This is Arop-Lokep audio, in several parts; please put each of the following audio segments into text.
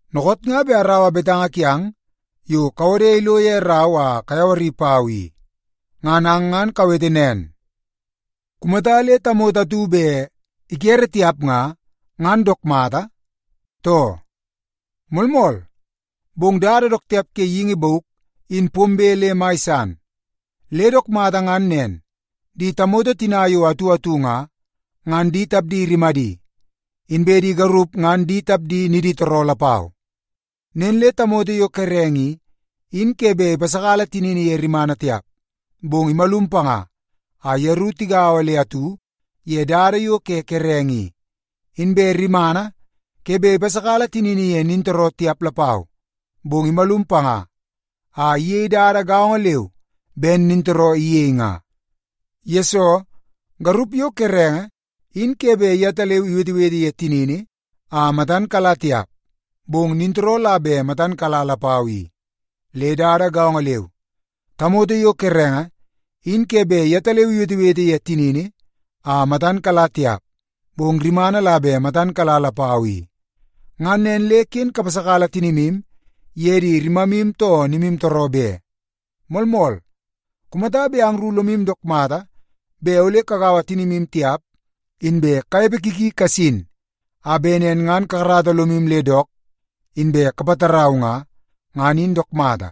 Dookoot nga bet araua betanga kiang yo kawode ilo ye rau a kayawari pau i. Ngan ang ngan kawete nen, kumata le tamoto atu bet ikere tiap nga, ngan dook mata, too? Moolmool, bong dada dook tiap ke geingi bauk in pombe le mai san, le dook mata ngan nen, di tamoto tina yo atu atu nga, ngan di tapdi rimadi, inbe di garup ngan di tapdi niditooroo lapau. Nen le tamoto yo kerenge i, in ke bet ipasakala tinini ye rimana tiap, bong imalum panga a yeru tigaua le atu ye dada yo ke kerenge i. Inbe rimana ke bet ipasakala tinini ye nintooroo tiap lapau, bong imalum panga a iyei dada gaongo leu ben nintooroo iyei nga. Yesoo, garup yo kerenge in ke bet yetaleu iwetewete ye tinini a matan kala tiap, bong nintooroo la bet matan kala lapau i. Le dada gaongo leu, tamoto yo kerenge in ke bet yetaleu iwetewete ye tinini a matan kala tiap, bong rimana la bet matan kala lapau i. Ngan nen le ken kapasakala tinimu ye di rimamu too nimutooroo be. Moolmool, kumata bet angru lomu dook mata bet ole kagaua tinimu tiap, inbe kanepe ki ki kasin a bet nen ngan kakarata lomu le dook inbe kapatarau nga, ngan in dook mata.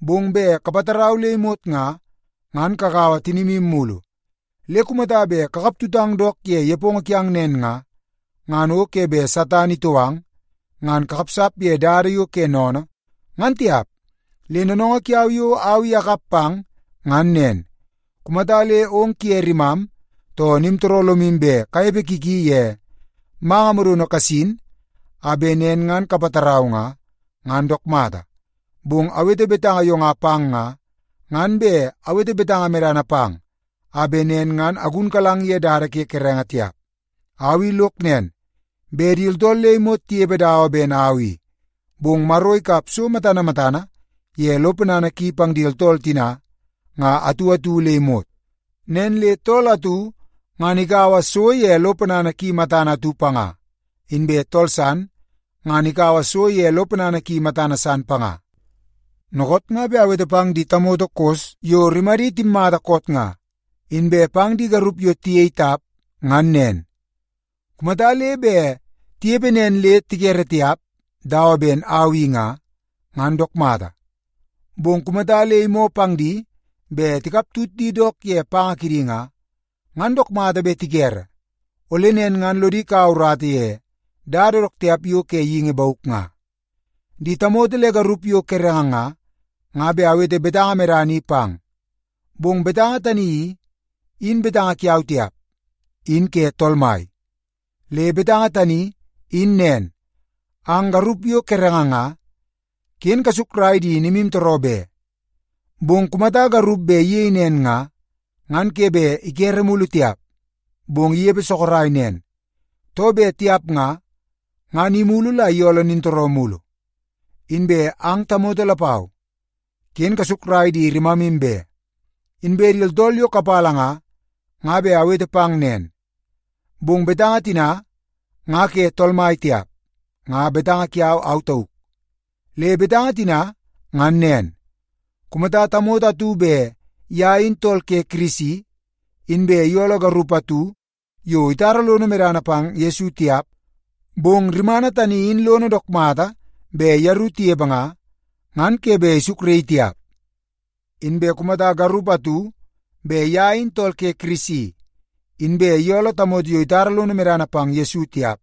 Bong bet kapatarau le imot nga, ngan kagaua tinimu mulu. Le kumata bet kakap tutang dook ye nepongo kiang nen nga, ngan o ke bet Satan itou ang ngan kakapsap ye dada yo ke sennene, ngan tiap. Le noonoongoo kiau yo au i akap pang ngan nen: Kumata le ong kuye rimam too nimtooroo lomu bet kanepe ki ki ye manga modono kasin a bet nen ngan kapatarau nga, ngan dook mata. Bong awete betanga yo nga pang nga, ngan bet awete betanga medana pang a bet nen ngan agunkalang ye dada ke kerenge tiap. Au i lok nen, bet di tooltool le imot tinepe dawa ben au i. Bong Maro ikap so matana matana ye lo ponana ki pang di tooltool tina nga atu atu le imot. Nen le tool atu ngan ikaua so ye lo ponana ki matana atu panga, inbe tool san ngan ikaua so ye lo ponana ki matana san panga. Dookoot nga bet awete pang di tamoto kos yo rimadi timmata koot nga, inbe pang di garup yo tiyei tap ngan nen. Kumata le bet tinepe nen le tikere tiap dawa ben au i nga, ngan dook mata. Bong kumata le imoo pang di bet tikap tut di dook ye panga kidi nga, ngan dook mata bet tikere, ole nen ngan lodi kaua urata ye dada dook tiap yo ke geingi bauk nga. Di tamoto le garup yo kerenge nga, nga bet awete betanga medana i pang. Bong betanga tani i, in betanga kiau tiap, in ke Tool Mai. Le betanga tani in nen: Ang garup yo kerenge nga, ken kasukrai di nimutooroo be. Bong kumata le garup bet iyei nen nga, ngan ke bet ikere mulu tiap, bong inepe sorok nen. Too bet tiap nga, ngan imulu la iyooloo nintooroo mulu. Inbe ang tamoto lapau, ken kasukrai di rimamu be. Inbe di tooltool yo kapala nga, nga bet awete pang nen. Bong betanga tina nga ke Tool Mai tiap, nga betanga kiau au tauk. Le betanga tina ngan nen: Kumata le tamoto atu bet ye in tool ke Kirisi, inbe iyooloo garup atu yo itara lono medana pang Yesu tiap, bong rimana tani in lono dook mata bet yeru tinepe nga, ngan ke bet isukraii tiap. Inbe kumata le garup atu bet ye in tool ke Kirisi, inbe iyooloo tamoto yo itara lono medana pang Yesu tiap,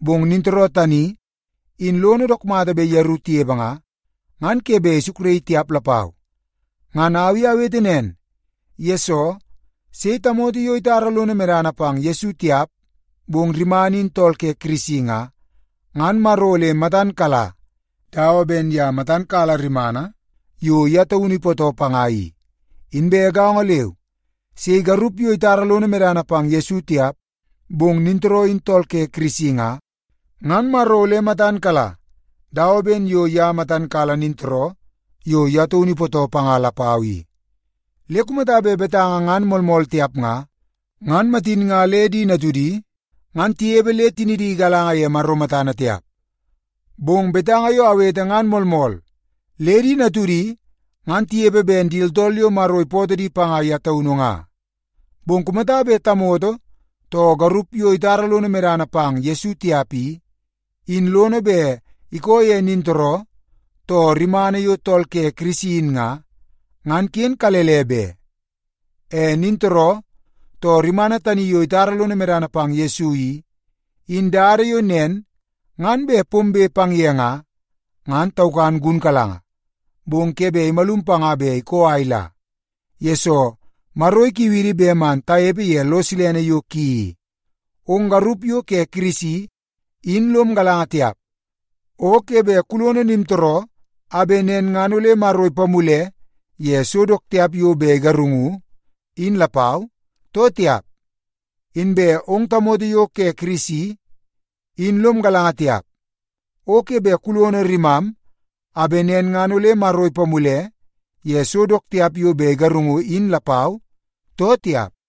bong nintooroo tani in lono dook mata bet yeru tinepe nga, ngan ke bet isukraii tiap lapau. Ngan au i awete nen, yesoo sei tamoto yo itara lono medana pang Yesu tiap, bong rimana in tool ke Kirisi nga, ngan Maro ole matan kala dawa ben ye matan kala rimana yo ye taunu ipootoo panga i. Inbe gaongo leu, sei garup yo itara lono medana pang Yesu tiap, bong nintooroo in tool ke Kirisi nga, ngan Maro ole matan kala dawa ben ye matan kala nintooroo yo ye taunu ipootoo panga lapau i. Le kumata bet betanga ngan moolmool tiap nga, ngan matin nga le di natudi ngan tinepe le tinidi igalanga ye Maro matana tiap. Bong betanga yo awete ngan moolmool le di natudi ngan ole tinepe ben di tooltool yo Maro ipootoo di panga ye taunu nga. Bong kumata bet tamoto too garup yo itara lono medana pang Yesu tiap i, in lono bet ikoo ye nintooroo too rimana yo tool ke Kirisi in nga, ngan ken kalele be. E nintooroo too rimana tani yo itara lono medana pang Yesu i, in dada yo nen ngan bet pombe pang ye nga, ngan taukan gunkalanga, bong ke bet imalum panga bet ikoo a ila, yesoo Maro ikiu idi bet man tanepe ye lo silene yo ki i. Ong garup yo ke Kirisi in lom galanga tiap, o ke bet kulono nimtooroo a bet nen ngan ole Maro ipamule ye so dook tiap yo bet igarungu in lapau, too tiap? Inbe ong tamoto yo ke Kirisi in lom galanga tiap, o ke bet kulono rimam a bet nen ngan ole Maro ipamule ye so dook tiap yo bet igarungu in lapau, too tiap?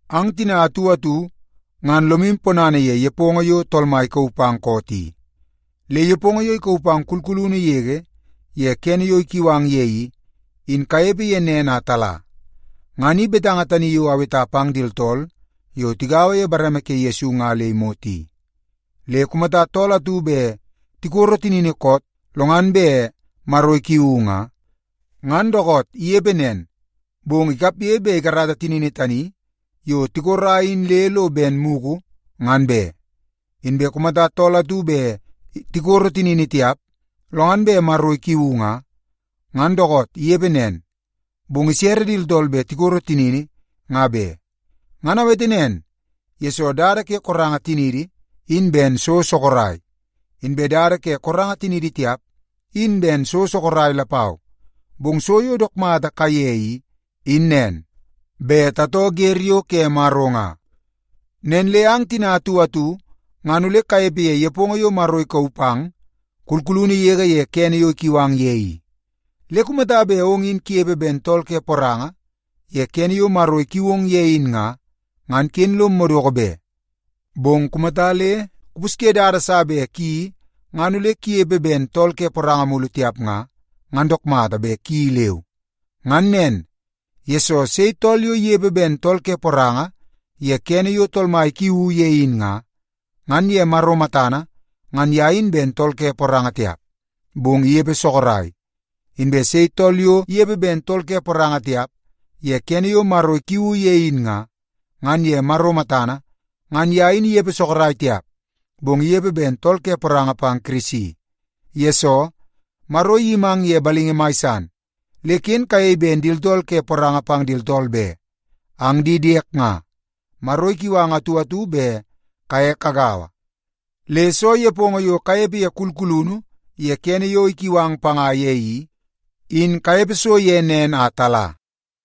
Ang tina atu atu ngan lomu ponana ye nepongo yo Tool Mai ikauu pang koot i. Le nepongo yo ikauu pang kulkulunu yege ye kene yo ikiu ang ye i, in kanepe ye nen a tala. Ngan i betanga tani yo aweta pang di tooltool yo tigaua ye bareme ke Yesu nga le imot i. Le kumata tool atu bet tikoro tinini koot lo ngan bet Maro ikiuu nga, ngan dookoot inepe nen, bong ikapge bet ikarata tinini tani yo tikora in le lo ben mugu ngan be. Inbe kumata tool atu bet tikoro tinini tiap, lo ngan bet Maro ikiuu nga, ngan dookoot inepe nen, bong isere di tooltool bet tikoro tinini nga be. Ngan awete nen, yesoo dada ke koranga tinidi, in ben so sorok. Inbe dada ke koranga tinidi tiap, in ben so sorok lapau. Bong so yo dook mata kaiye i, in nen; bet tatoo wer yo ke Maro nga. Nen le ang tina atu atu ngan ole kanepe ye nepongo yo Maro ikauu pang kulkulunu yege ye kene yo ikiu ang ye i. Le kumata bet ong in kunepe ben tool ke poranga ye kene yo Maro ikiu ong ye in nga, ngan ken lom madoko be. Bong kumata le kupusye dada sa bet kuyeii ngan ole kunepe ben tool ke poranga mulu tiap nga, ngan dook mata bet kuyeii leu. Ngan nen, yesoo sei tool yo inepe ben tool ke poranga ye kene yo Tool Mai ikiuu ye in nga, ngan ye Maro matana ngan ye in ben tool ke poranga tiap, bong inepe sorok. Inbe sei tool yo inepe ben tool ke poranga tiap ye kene yo Tool Mai ikiuu ye in nga, ngan ye Maro matana ngan ye in inepe sorok tiap, bong inepe ben tool ke poranga pang Kirisi. Yesoo, Maro iyimang ye balingi mai san, le ken kayei ben di tooltool ke poranga pang di tooltool be. Ang di diek nga, Maro ikiu ang atu atu bet kaye kagaua. Le soo nepongo yo kanepe ye kulkulunu ye kene yo ikiu ang panga ye i, in kanepe so ye nen a tala.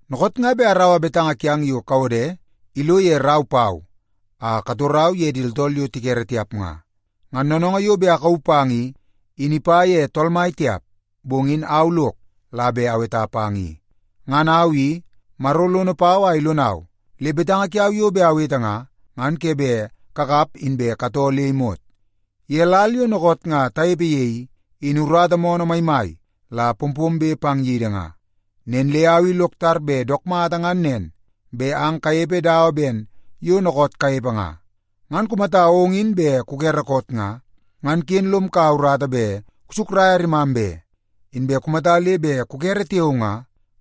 Dookoot nga bet araua betanga kiang yo kawode ilo ye rau pau a katorau ye di tooltool yo tikere tiap nga. Ngan noonoongoo yo bet akauu pang i, in ipa ye Tool Mai tiap, bong in au lok la bet aweta pang i. Ngan au i, Maro lono pau a ilonau, le betanga kiau yo bet awete nga, ngan ke bet kakap inbe katoo le imot. Ye lal yo dookoot nga tanepe ye i, in urata moonoo maimai la pompombe pang yidi nga. Nen le au i lok tar bet dook mata ngan nen, bet ang kanepe dawa ben yo dookoot kanepe nga. Ngan kumata ong in bet kukere koot nga, ngan ken lom kaua urata bet kusukraia rimam be. Inbe kumata le bet kukere tiao nga,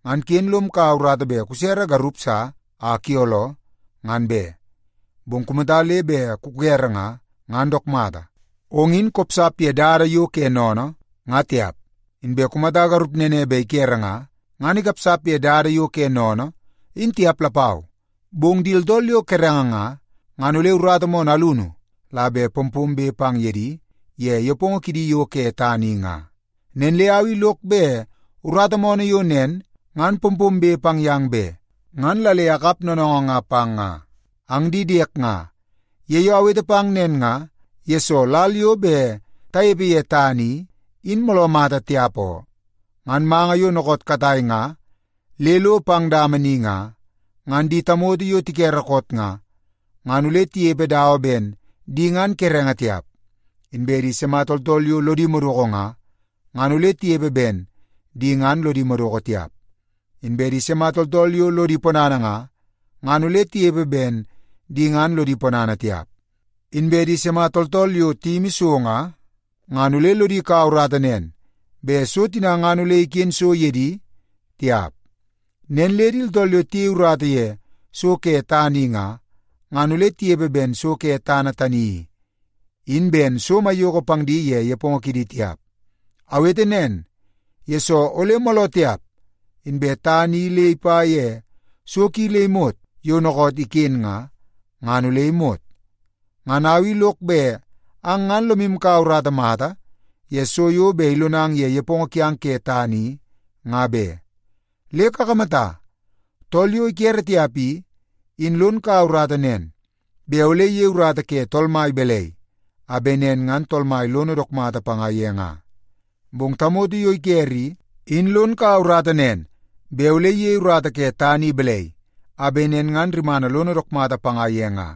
ngan ken lom kaua urata bet kusere garup sa a kuyooloo, ngan be. Bong kumata le bet kukere nga, ngan dook mata, ong in kopsap ye dada yo ke sennene nga tiap. Inbe kumata garup nene bet ikere nga, ngan ikapsap ye dada yo ke sennene in tiap lapau. Bong di tooltool yo kerenge nga, ngan ole urata moonoo alunu la bet pompombe pang ye di ye nepongo kidi yo ke tana i nga. Nen le au i lok bet urata moonoo yo nen ngan pompombe pang yang be, ngan la le akap noonoongoo nga pang nga. Ang di diek nga, ye yo awete pang nen nga, yesoo lal yo bet tanepe ye tana i, in mooloo mata tiap oo. Ngan manga yo dookoot katai nga le lo pang dama ni nga, ngan di tamoto yo tikere koot nga, ngan ole tinepe dawa ben di ngan kerenge tiap. Inbe di sima tooltool yo lodi madoko nga, ngan ole tinepe ben di ngan lodi madoko tiap. Inbe di sima tooltool yo lodi ponana nga, ngan ole tinepe ben di ngan lodi ponana tiap. Inbe di sima tooltool yo tiyimi so nga, ngan ole lodi kaua urata nen bet so tina ngan ole iken so ye di tiap. Nen le di tooltool yo tiyei urata ye so ke tana i nga, ngan ole tinepe ben so ke tana tani i, in ben so maiyoko pang di ye nepongo kidi tiap. Awete nen, yesoo ole mooloo tiap, inbe tana tani i le ipa ye so ki le imot yo dookoot iken ye nga, ngan ole imot. Ngan au i lok bet ang ngan lomu kaua urata mata ye so yo bet ilonang ye nepongo kiang ke tana i, nga be. Le kakamata, tool yo ikere tiap i, in lon kaua urata nen, bet ole iyei urata ke Tool Mai balai, a bet nen ngan Tool Mai lono dook mata panga ye nga. Bong tamoto yo ikere i, in lon kaua urata nen, bet ole iyei urata ke tana i balai, a bet nen ngan rimana lono dook mata panga ye nga.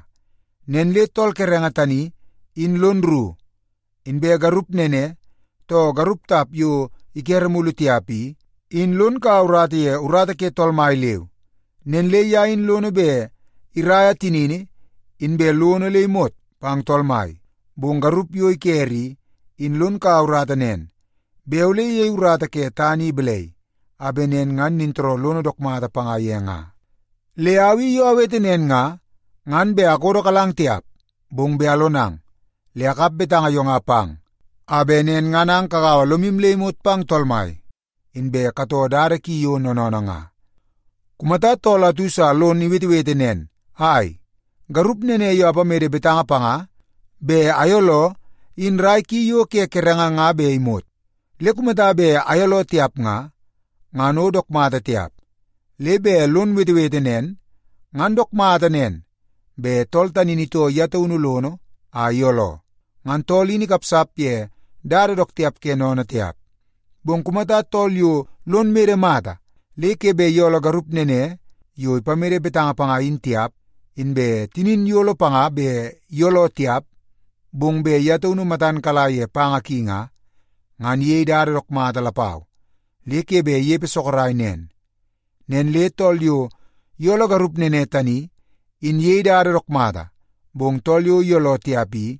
Nen le tool kerenge tani in lon rru. Inbe garup nene, too garup tap yo ikere mulu tiap i, in lon kaua urata ye urata ke Tool Mai leu. Nen le ye in lono bet iraia tinini inbe lono le imot pang Tool Mai. Bong garup yo ikere i, in lon kaua urata nen, bet ole iyei urata ke tana i balai, a bet nen ngan nintooroo lono dook mata panga ye nga. Le au i yo awete nen nga, ngan bet akodokalang tiap, bong bet alonang. Le akap betanga yo nga pang, a bet nen ngan ang kagaua lomu le imot pang Tool Mai, inbe katoo dada ki yo noonoonoo nga. Kumata tool atu sa lon wetewete nen, “Ai, garup nene yo apamede betanga panga bet ayooloo in rai ki yo ke kerenge nga bet imot. Le kumata bet ayooloo tiap nga, ngan o dook mata tiap.” Le bet lon wetewete nen nga, ngan dook mata nen bet tool tani in itoo ye taunu lono a iyooloo. Ngan tool in ikapsap ye dada dook tiap ke sennene tiap. Bong kumata tool yo lon mede mata le ke bet iyooloo garup nene yo ipamede betanga panga in tiap, inbe tinin iyolo panga bet iyooloo tiap, bong bet ye taunu matan kala ye panga ki nga, ngan iyei dada dook mata lapau le ke bet inepe sorok nen. Nen le tool yo iyooloo garup nene tani, in iyei dada dook mata, bong tool yo iyooloo tiap i,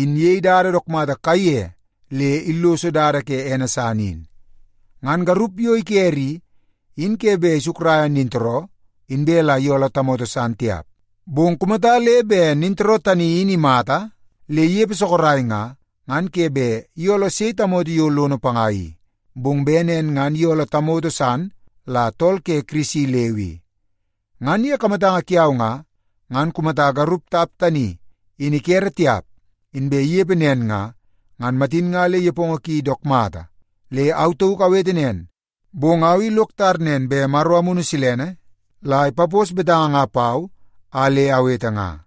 in iyei dada dook mata kaiye le illoso dada ke ene san in. Ngan garup yo ikere i, in ke bet isukraia nintooroo, inbe la iyooloo tamoto san tiap. Bong kumata le bet nintooroo tani in imata le inepe sorok nga, ngan ke bet iyooloo sei tamoto yo lono panga i. Bong bet nen ngan iyooloo tamoto san la tool ke Kirisi leu i. Ngan ye kamatanga kiau nga, ngan kumata garup tap tani in ikere tiap, inbe inepe nen nga, ngan matin nga le nepongo ki dook mata. Le au tauk awete nen, bong au i lok tar nen bet Maro Amunu Silene la ipapos betanga nga pau a le awete i.